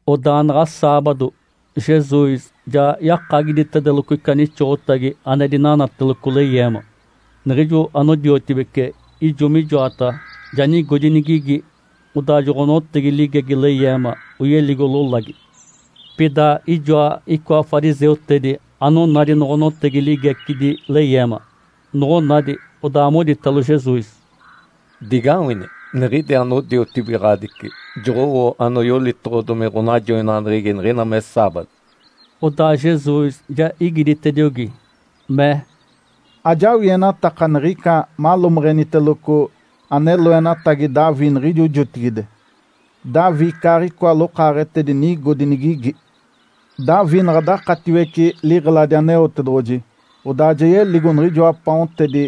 Odaa naɡ̶a saabado, Jesus ja yakagiditedeloco ica nixoɡ̶otagi ane dinanateloco leyeema. Niɡ̶ijo anodiotibece ijo mijoataɡ̶a, ja nigodi nigigi. Odaa joɡ̶onotegi ligegi leyeema oyeligo lolagi. Pida ijoa icoa fariseutedi anonadi noɡ̶onotegi ligecidi leyeema. Noɡ̶onadi, odaa moditalo Jesus, “Digawini! Niɡ̶idi anodiotibigaɡ̶adici joɡ̶owo ane yolitoɡ̶odomi ɡ̶onajoinaɡ̶aneɡ̶egi niɡ̶ina me saabado.” Odaa Jesus ja igiditediogi, mee, “Ajawienataka niɡ̶ica malomeɡ̶eniteloco ane loenatagi Davi niɡ̶ijo jotigide, Davi icaaɡ̶icoa lokaaɡ̶etedi nigodi nigigi. Davi naɡ̶a dakatiwece liɡ̶eladi Aneotedoɡ̶oji, odaa ja yeligo niɡ̶ijoa paontedi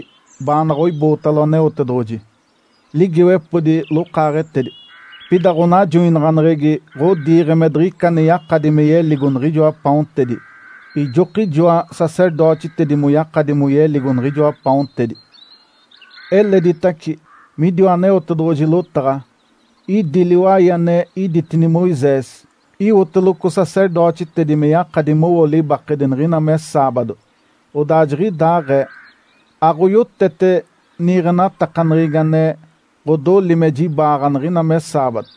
baanaɡ̶a oibootalo Aneotedoɡ̶oji, ligiiwepodi lokaaɡ̶etedi. Pida ɡ̶onajoinaɡ̶aneɡ̶egi ɡ̶odiiɡ̶e me diɡ̶ica ane yakadi me yeligo niɡ̶ijoa paontedi. Ijokijoa sacerdotitedi moyakadi moyeligo niɡ̶ijoa paontedi. Eleditace, midiwa Aneotedoɡ̶oji lotaɡ̶a, idi liwai ane iditini Moisés, iwoteloco sacerdotitedi me yakadi mowo libakedi niɡ̶ina me saabado, odaa jiɡ̶idaaɡ̶ee, aɡ̶oyotete niiɡ̶enatakaneɡ̶egi ane ɡ̶odoli me jibaaɡ̶a niɡ̶ina me saabado,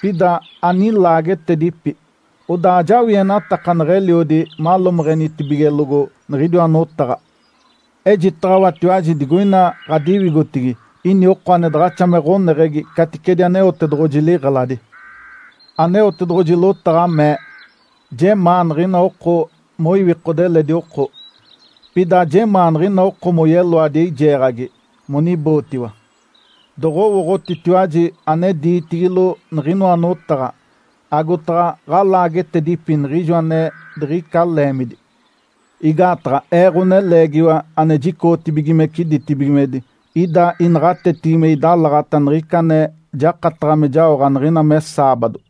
pida anilaagetedipi. Odaa ajawienataka neɡ̶eliodi malomeɡ̶enitibigelogo niɡ̶idiwa notaɡ̶a. Ejitaɡ̶awatiwaji digoina ɡ̶adiwigotigi ini oko ane daɡ̶axa me ɡ̶oneɡ̶egi caticedi Aneotedoɡ̶oji liɡ̶eladi. Aneotedoɡ̶oji lotaɡ̶a mee, ‘Jemaa niɡ̶ina oko moiwikode eledi oko, pida ajemaa niɡ̶ina oko moyeloadi eijeeɡ̶agi monibootiwa.’ Doɡ̶owooɡ̶otitiwaji ane diitigilo niɡ̶inoa notaɡ̶a, agotaɡ̶a ɡ̶alaagetedipi niɡ̶ijo ane diɡ̶ica leemidi. Igaataɡ̶a Ee, Ǥoneleegiwa ane jicoɡ̶otibigimece ditibigimedi, ida inaɡ̶atetigi me idalaɡ̶ata niɡ̶ica ane jakataɡ̶a me jaoɡ̶a niɡ̶ina me saabado.”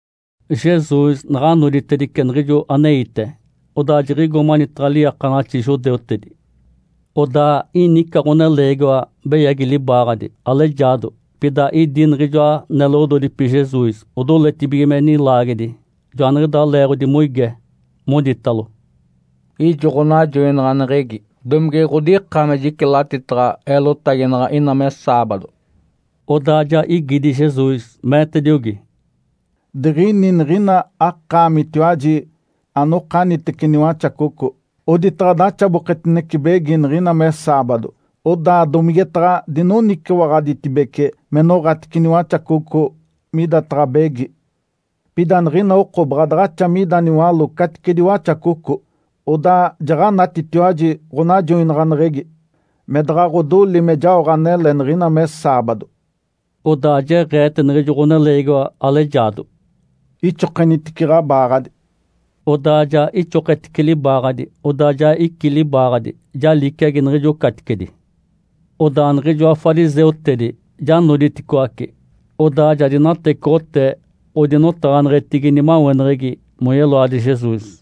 Jesus naɡ̶a noditedice niɡ̶ijo aneite, odaa jiɡ̶igo manitaɡ̶a liiakanaɡ̶axi judeutedi. Odaa ini ica ɡ̶oneleegiwa beyagi libaaɡ̶adi, alejaado. Pida idi niɡ̶ijoa neloɡ̶ododipi Jesus odoletibige me nilaagedi. Joaniɡ̶idaa leeɡ̶odi moige, moditalo, “Ijo ɡ̶onajoinaɡ̶aneɡ̶egi, domige ɡ̶odika me jicilatitaɡ̶a eelotaginaɡ̶a ina me saabado?” Odaa ja igidi Jesus, meetediogi, “Diɡ̶ini niɡ̶ina akaamitiwaji anokanitece niwaxacoco, oditaɡ̶a daxaboketinece begi niɡ̶ina me saabado, odaa domigetaɡ̶a dinoniciwaɡ̶aditibece me noɡ̶atice niwaxacoco midataɡ̶a begi. Pida niɡ̶ina oko baɡ̶a daɡ̶axa mida niwaló caticedi waxacoco. Odaa jaɡ̶anatitiwaji ɡ̶onajoinaɡ̶aneɡ̶egi me daɡ̶a ɡ̶odoli me jaoɡ̶a anele niɡ̶ina me saabado.” Odaa jeɡ̶eete niɡ̶ijo ɡ̶oneleegiwa alejaado, “Ixokenitice ɡ̶abaaɡ̶adi!” Odaa ja ixoketice libaaɡ̶adi, odaa ja icí libaaɡ̶adi, ja liciagi niɡ̶ijo caticedi. Odaa niɡ̶ijoa fariseutedi ja noditicoaci, odaa ja dinatecoɡ̶otee odinotaɡ̶aneɡ̶etigi nimaweneɡ̶egi moyeloadi Jesus.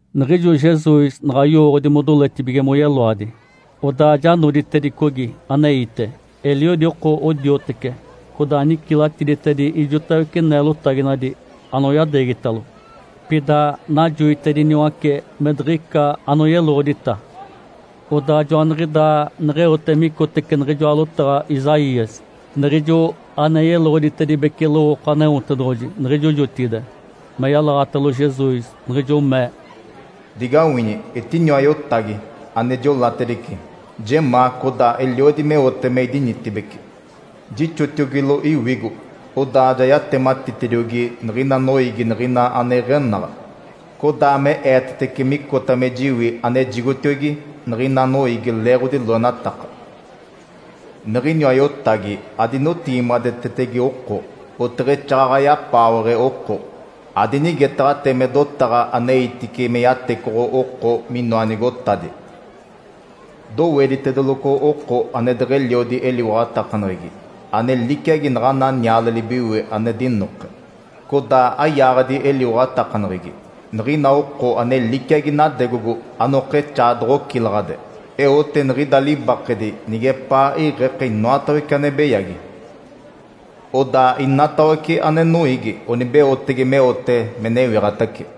Niɡ̶ijo Jesus naɡ̶a yowooɡ̶odi modoletibige moyeloadi, odaa ja noditedicogi aneite. Eliodi oko odiotece, codaa nicilatiditedi ijotawece neelotaginadi anoyadeegitalo. Pida najoitediniwace me diɡ̶ica anoyeloɡ̶odita. Odaa joaniɡ̶idaa neɡ̶eote micotece niɡ̶ijoa lotaɡ̶a Isaías, niɡ̶ijo ane yeloɡ̶oditedibece lowooko Aneotedoɡ̶oji niɡ̶ijo jotigide, me yalaɡ̶atalo Jesus, niɡ̶ijo mee, “Digawini! Etiniwa Iotagi, ane jiolatedice. Jemaa, codaa eliodi meote me idinitibeci. Jixotiogilo Iwigo. Odaa ja yatematitediogi niɡ̶ina noiigi niɡ̶ina ane iɡ̶enaɡ̶a, codaa me eetetece micota me jiwi anejigotiogi niɡ̶ina noiigi leeɡ̶odi loenataka. Niɡ̶iniwa Iotagi adinotigimadetetege oko, oteɡ̶exaaɡ̶aɡ̶a yapaawe oko. Adinigetaɡ̶atee me dotaɡ̶a aneitice me yatecoɡ̶o oko minoa nigotadi. Doweditedeloco oko ane deɡ̶eliodi eliwaɡ̶atakaneɡ̶egi, ane liciagi naɡ̶ana niale libiwe ane dinoke, codaa ayaaɡ̶adi eliwaɡ̶atakaneɡ̶egi, niɡ̶ina oko ane liciagi nadegogo anokexaa doɡ̶ocilaɡ̶ade. Eote niɡ̶ida libakedi nigepaa iɡ̶eke inoatawece ane beyagi. Odaa inatawece ane noiigi onibeotege meote me newiɡ̶atace.”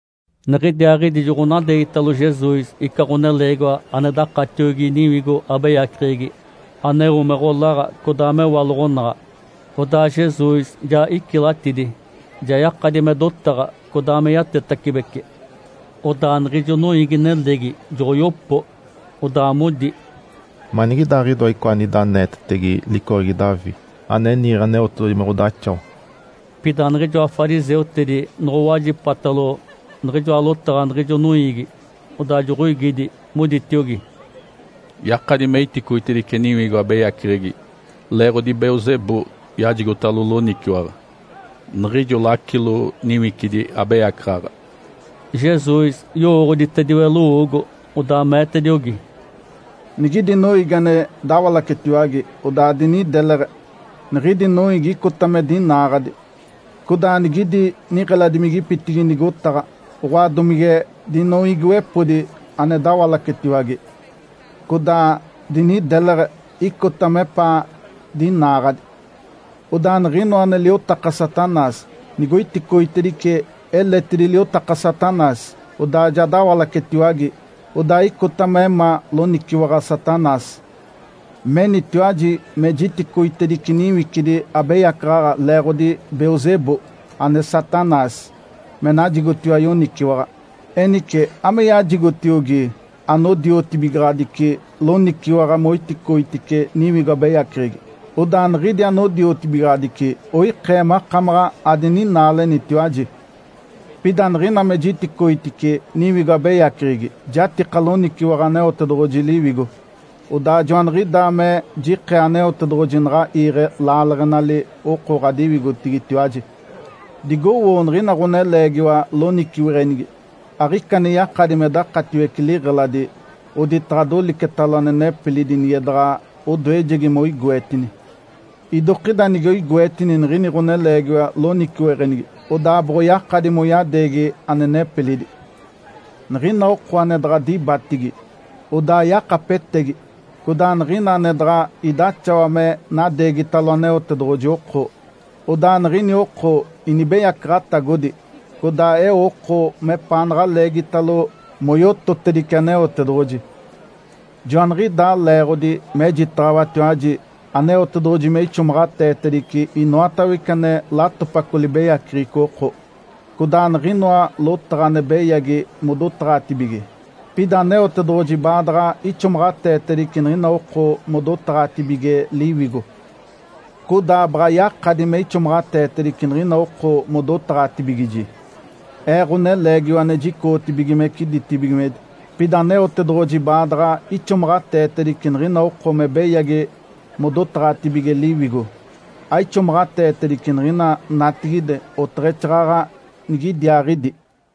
Niɡ̶idiaaɡ̶idi joɡ̶onadeegitalo Jesus ica ɡ̶oneleegiwa ane dakatiogi niwigo abeyaceɡ̶egi aneo me ɡ̶olaɡ̶a codaa mewaloɡ̶onaɡ̶a. Odaa Jesus ja icilatidi, ja yakadi me dotaɡ̶a, codaa me yatetacibece. Odaa niɡ̶ijo noiigi-nelegi joɡ̶oyopo, odaa modi, “Manigidaaɡ̶idoa icoa anida aneetetege licoɡ̶egi Davi ane niiɡ̶e Aneotedoɡ̶oji me ɡ̶odaxawa?” Pida niɡ̶ijoa fariseutedi noɡ̶owajipatalo niɡ̶ijoa lotaɡ̶a niɡ̶ijo noiigi, odaa joɡ̶oigidi, moditiogi, “Yakadi me iticoitedice niwigo abeyaceɡ̶egi leeɡ̶odi Belzebu yajigotalo loniciwaɡ̶a, niɡ̶ijo lacilo niwicidi abeyacaɡ̶aɡ̶a.” Jesus yowooɡ̶oditediwe lowoogo, odaa meetediogi, “Nigidi noiigi ane dawalacetiwage, odaa dinideleɡ̶e, niɡ̶idi noiigi icota me dinaaɡ̶adi. Codaa nigidi niɡ̶eladimigipitigi nigotaɡ̶a, oɡ̶oa domige dinoiigiwepodi, ane dawalacetiwage, codaa dinideleɡ̶e, icota mepaa dinaaɡ̶adi. Odaa niɡ̶inoa ane liotaka Satanás nigoiticoitedice eletidi liotaka Satanás, odaa ja dawalacetiwage, odaa icota me ma loniciwaɡ̶a Satanás. Menitiwaji me jiticoitedice niwicidi abeyacaɡ̶aɡ̶a leeɡ̶odi Belzebu, ane Satanás, me najigotiwa yoniciwaɡ̶a. Enice ame yajigotiogi anodiotibigaɡ̶adici loniciwaɡ̶a moiticoitice niwigo abeyaceɡ̶egi? Odaa niɡ̶idi anodiotibigaɡ̶adici oikee makamaɡ̶a adininaalenitiwaji. Pida niɡ̶ina me jiticoitice niwigo abeyaceɡ̶egi, jatika loniciwaɡ̶a Aneotedoɡ̶oji Liwigo. Odaa joaniɡ̶idaa me jikee Aneotedoɡ̶oji naɡ̶a iiɡ̶e laaleɡ̶enali oko ɡ̶adiwigotigitiwaji. Digowoo niɡ̶ina ɡ̶oneleegiwa loniciweɡ̶enigi. Aɡ̶ica ane yakadi me dakatiwece liɡ̶eladi, oditaɡ̶a dolicetalo ane nepilidi nige daɡ̶a odoejegi me oigoetini. Idokida nige oigoetini niɡ̶ini ɡ̶oneleegiwa loniciweɡ̶enigi odaa boɡ̶oyakadi moyadeegi ane nepilidi. Niɡ̶ina oko ane daɡ̶a dibatigi, odaa yakapetegi. Codaa niɡ̶ina ane daɡ̶a idaxawa me nadeegitalo Aneotedoɡ̶oji oko, odaa niɡ̶ini oko inibeyacaɡ̶atagodi, codaa eo oko mepaanaɡ̶a leegitalo moyototedice Aneotedoɡ̶oji. Joaniɡ̶idaa leeɡ̶odi mejitaɡ̶awatiwaji Aneotedoɡ̶oji me ixomaɡ̶ateetedice inoatawece ane latopaco libeyaceɡ̶eco oko, codaa niɡ̶inoa lotaɡ̶a ane beyagi modotaɡ̶atibige. Pida Aneotedoɡ̶oji baadaɡ̶a ixomaɡ̶ateetedice niɡ̶ina oko modotaɡ̶atibige Liwigo. Codaa baɡ̶a yakadi me ixomaɡ̶ateetedice niɡ̶ina oko modotaɡ̶atibigiji, Ee, Ǥoneleegiwa ane jicoɡ̶otibigimece ditibigimedi. Pida Aneotedoɡ̶oji baadaɡ̶a ixomaɡ̶ateetedice niɡ̶ina oko me beyagi modotaɡ̶atibige Liwigo, aixomaɡ̶ateetedice niɡ̶ina natigide, oteɡ̶exaaɡ̶aɡ̶a nigidiaaɡ̶idi.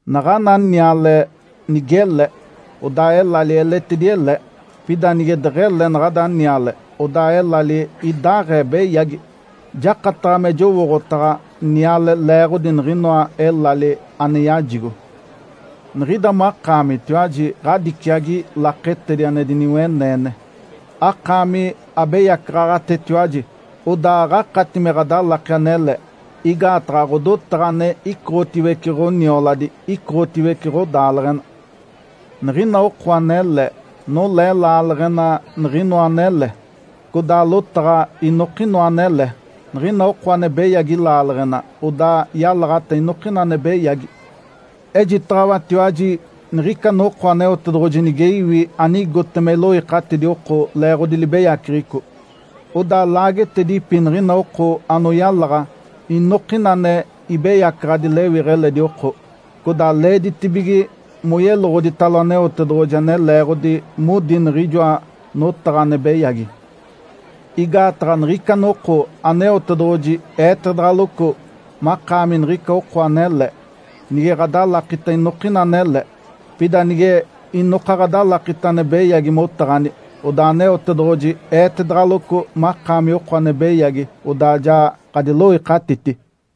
Naɡ̶ana niale nigele, odaa elali eletidi ele, pida nige deɡ̶ele naɡ̶ada niale, odaa elali idaaɡ̶ee beyagi. Jakataɡ̶a me jowooɡ̶otaɡ̶a niale leeɡ̶odi niɡ̶inoa elali ane yajigo. Niɡ̶ida makaamitiwaji ɡ̶adiciagi laketedi ane diniweneene. Akaami abeyacaɡ̶aɡ̶atetiwaji, odaa aɡ̶akati me ɡ̶adalaki anele. Igaataɡ̶a ɡ̶odotaɡ̶a ane icoɡ̶otiwece ɡ̶onioladi, icoɡ̶otiwece ɡ̶odaaleɡ̶ena. Niɡ̶ina oko anele, nolee laaleɡ̶ena niɡ̶inoa anele, codaa lotaɡ̶a inokinoa anele. Niɡ̶ina oko ane beyagi laaleɡ̶ena, odaa yalaɡ̶ata inokina ane beyagi. Ejitaɡ̶awatiwaji niɡ̶ica noko Aneotedoɡ̶oji nige iwi anigote me iloikatidi oko leeɡ̶odi libeyaceɡ̶eco, odaa laagetedipi niɡ̶ina oko anoyalaɡ̶a inokina ane ibeyacaɡ̶adi lewiɡ̶a eledi oko. Codaa leeditibige moyeloɡ̶oditalo Aneotedoɡ̶oji ane leeɡ̶odi modi niɡ̶ijoa notaɡ̶a ane beyagi. Igaataɡ̶a niɡ̶ica noko Aneotedoɡ̶oji eetedaɡ̶aloco makaami niɡ̶ica oko anele nige ɡ̶adalakita inokina anele, pida nige inoka ɡ̶adalakita ane beyagi motaɡ̶ani, odaa Aneotedoɡ̶oji eetedaɡ̶aloco makaami oko ane beyagi, odaa ja ɡ̶adiloikatiti.”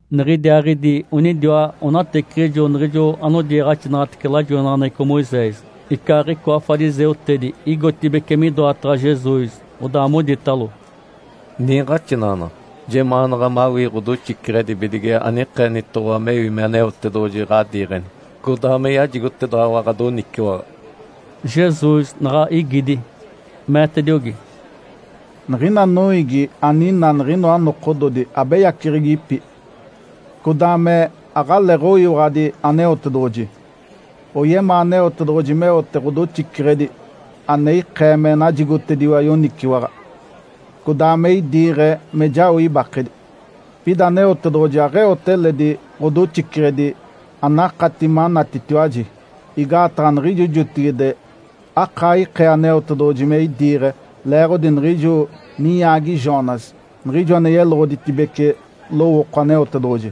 Niɡ̶idiaaɡ̶idi onidiwa onateciɡ̶ijo niɡ̶ijo anodiiɡ̶axinaɡ̶atece lajoinaɡ̶aneɡ̶eco Moisés, icaaɡ̶icoa fariseutedi igotibeci midoataɡ̶a Jesus, odaa moditalo, “Niiɡ̶axinaɡ̶anaɡ̶a, jemaanaɡ̶a mawii ɡ̶odoxiceɡ̶edi bidige anikeenitoɡ̶owa mewi me Aneotedoɡ̶oji ɡ̶adiiɡ̶eni, codaa me yajigotedaɡ̶awa ɡ̶adoniciwaɡ̶a.” Jesus naɡ̶a igidi, meetediogi, “Niɡ̶ina noiigi aninaa niɡ̶inoa nokododi abeyaceɡ̶egipi, codaa me aɡ̶aleeɡ̶oyiwaɡ̶adi Aneotedoɡ̶oji. Oyemaa Aneotedoɡ̶oji meote ɡ̶odoxiceɡ̶edi ane ikee me najigotediwa yoniciwaɡ̶a, codaa me idiiɡ̶e me jao ibakedi. Pida Aneotedoɡ̶oji aɡ̶eote eledi ɡ̶odoxiceɡ̶edi anakati manatitiwaji. Igaataɡ̶a niɡ̶ijo jotigide akaa ikee Aneotedoɡ̶oji me idiiɡ̶e leeɡ̶odi niɡ̶ijo ninyaagi Jonas, niɡ̶ijo ane yeloɡ̶oditedibece lowooko Aneotedoɡ̶oji.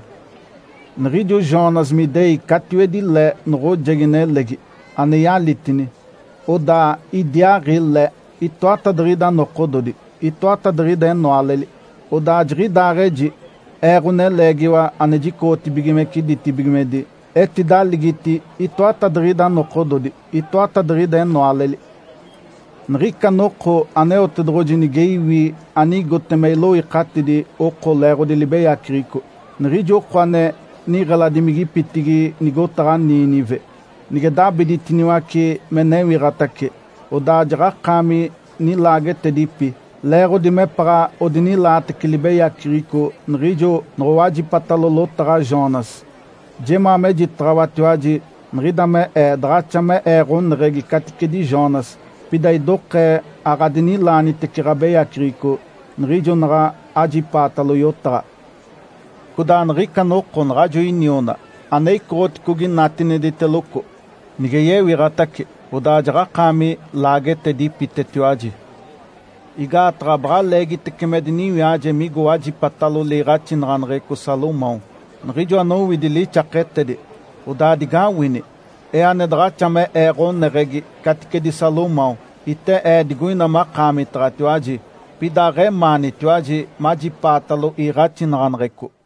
Niɡ̶ijo Jonas me idei catiwedi le noɡ̶ojegi nelegi, ane yalitini, odaa idiaaɡ̶i le itoatadiɡ̶ida nokododi, itoatadiɡ̶ida enoaleli. Odaa jiɡ̶idaɡ̶aɡ̶eji Ee, Ǥoneleegiwa ane jicoɡ̶otibigimece ditibigimedi, etidaligiti itoatadiɡ̶ida nokododi, itoatadiɡ̶ida enoaleli. Niɡ̶ica noko Aneotedoɡ̶oji nige iwi anigote me iloikatidi oko leeɡ̶odi libeyaceɡ̶eco, niɡ̶ijo oko ane niɡ̶eladimigipitigi nigotaɡ̶a Nínive nige dabiditiniwace me newiɡ̶atace, odaa jaɡ̶akaami nilaagetedipi, leeɡ̶odi mepaɡ̶a odinilaatece libeyaceɡ̶eco niɡ̶ijo noɡ̶owajipatalo lotaɡ̶a Jonas. Jemaa mejitaɡ̶awatiwaji, niɡ̶ida me Ee daɡ̶axa me Ee ɡ̶oneɡ̶egi caticedi Jonas, pida idokee aɡ̶adinilaanitece ɡ̶abeyaceɡ̶eco niɡ̶ijo naɡ̶a ajipaatalo yotaɡ̶a. Codaa niɡ̶ica noko naɡ̶ajo iniona, ane icoɡ̶oticogi natinediteloco, nige yewiɡ̶atace, odaa jaɡ̶akaami laagetedipitetiwaji, igaataɡ̶a baɡ̶a leegitece me diniwiaje migo wajipatalo liiɡ̶axinaɡ̶aneɡ̶eco Salomão, niɡ̶ijo anowidi lixaketedi. Odaa digawini! Ee, ane daɡ̶axa me Ee ɡ̶oneɡ̶egi caticedi Salomão, ite Ee digoina makaamitaɡ̶atiwaji. Pida aɡ̶emaanitiwaji majipaatalo iiɡ̶axinaɡ̶aneɡ̶eco.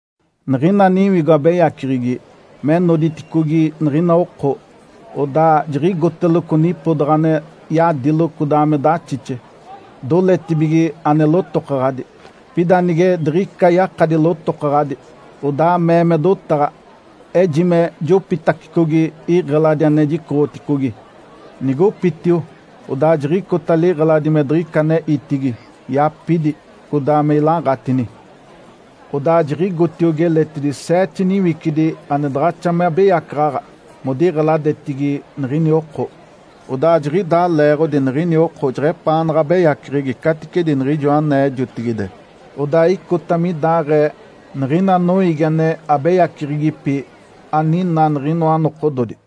Niɡ̶ina niwigo abeyaceɡ̶egi me noditicogi niɡ̶ina oko, odaa jiɡ̶igoteloco nipodaɡ̶a ane yadilo codaa me daxixe, doletibige ane lotokaɡ̶adi. Pida nige diɡ̶ica yakadi lotokaɡ̶adi, odaa mee me dotaɡ̶a, ‘Ejime jopitacicogi iɡ̶eladi ane jicoɡ̶oticogi.’ Nigopitio, odaa jiɡ̶icota liɡ̶eladi me diɡ̶ica ane itidi, yapidi, codaa me ilaaɡ̶atini. Odaa jiɡ̶igotiogi eletidi seete niwicidi ane daɡ̶axa me abeyacaɡ̶aɡ̶a modiɡ̶eladetigi niɡ̶ini oko. Odaa jiɡ̶idaa leeɡ̶odi niɡ̶ini oko jeɡ̶epaanaɡ̶a abeyaceɡ̶egi caticedi niɡ̶ijo anee jotigide. Odaa icota midaaɡ̶ee, niɡ̶ina noiigi ane abeyaceɡ̶egipi aninaa niɡ̶inoa nokododi.”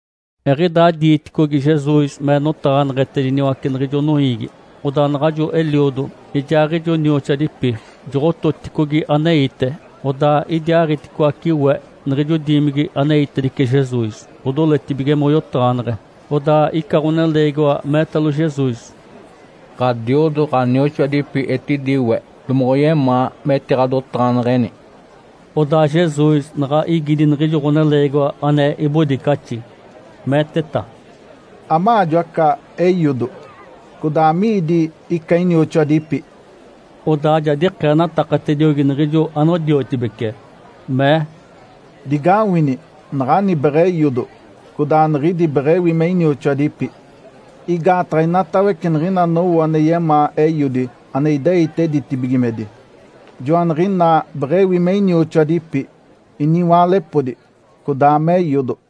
Eɡ̶idaa diiticogi Jesus me notaɡ̶aneɡ̶etediniwace niɡ̶ijo noiigi, odaa naɡ̶ajo eliodo, ijaaɡ̶ijo nioxoadipi joɡ̶ototicogi aneite. Odaa idiaaɡ̶iticoaci we niɡ̶ijo diimigi aneitedice Jesus, odoletibige moyotaɡ̶aneɡ̶e. Odaa ica ɡ̶oneleegiwa meetalo Jesus, “Ǥadiodo, ɡ̶anioxoadipi etidi we. Domoɡ̶oyemaa metiɡ̶adotaɡ̶aneɡ̶eni.” Odaa Jesus naɡ̶a igidi niɡ̶ijo ɡ̶oneleegiwa ane ibodicaxi, meeteta, “Amaajo aca eiodo? Codaa amiidi ica inioxoadipi?” Odaa ja dikeenatakatediogi niɡ̶ijo anodiotibece, mee, “Digawini! Naɡ̶ani beɡ̶eiodo, codaa niɡ̶idi beɡ̶ewi me inioxoadipi! Igaataɡ̶a inatawece niɡ̶ina anowo ane yemaa Eiodi ane ideite ditibigimedi, joaniɡ̶inaa beɡ̶ewi me inioxoadipi, iniwaalepodi, codaa me eiodo.”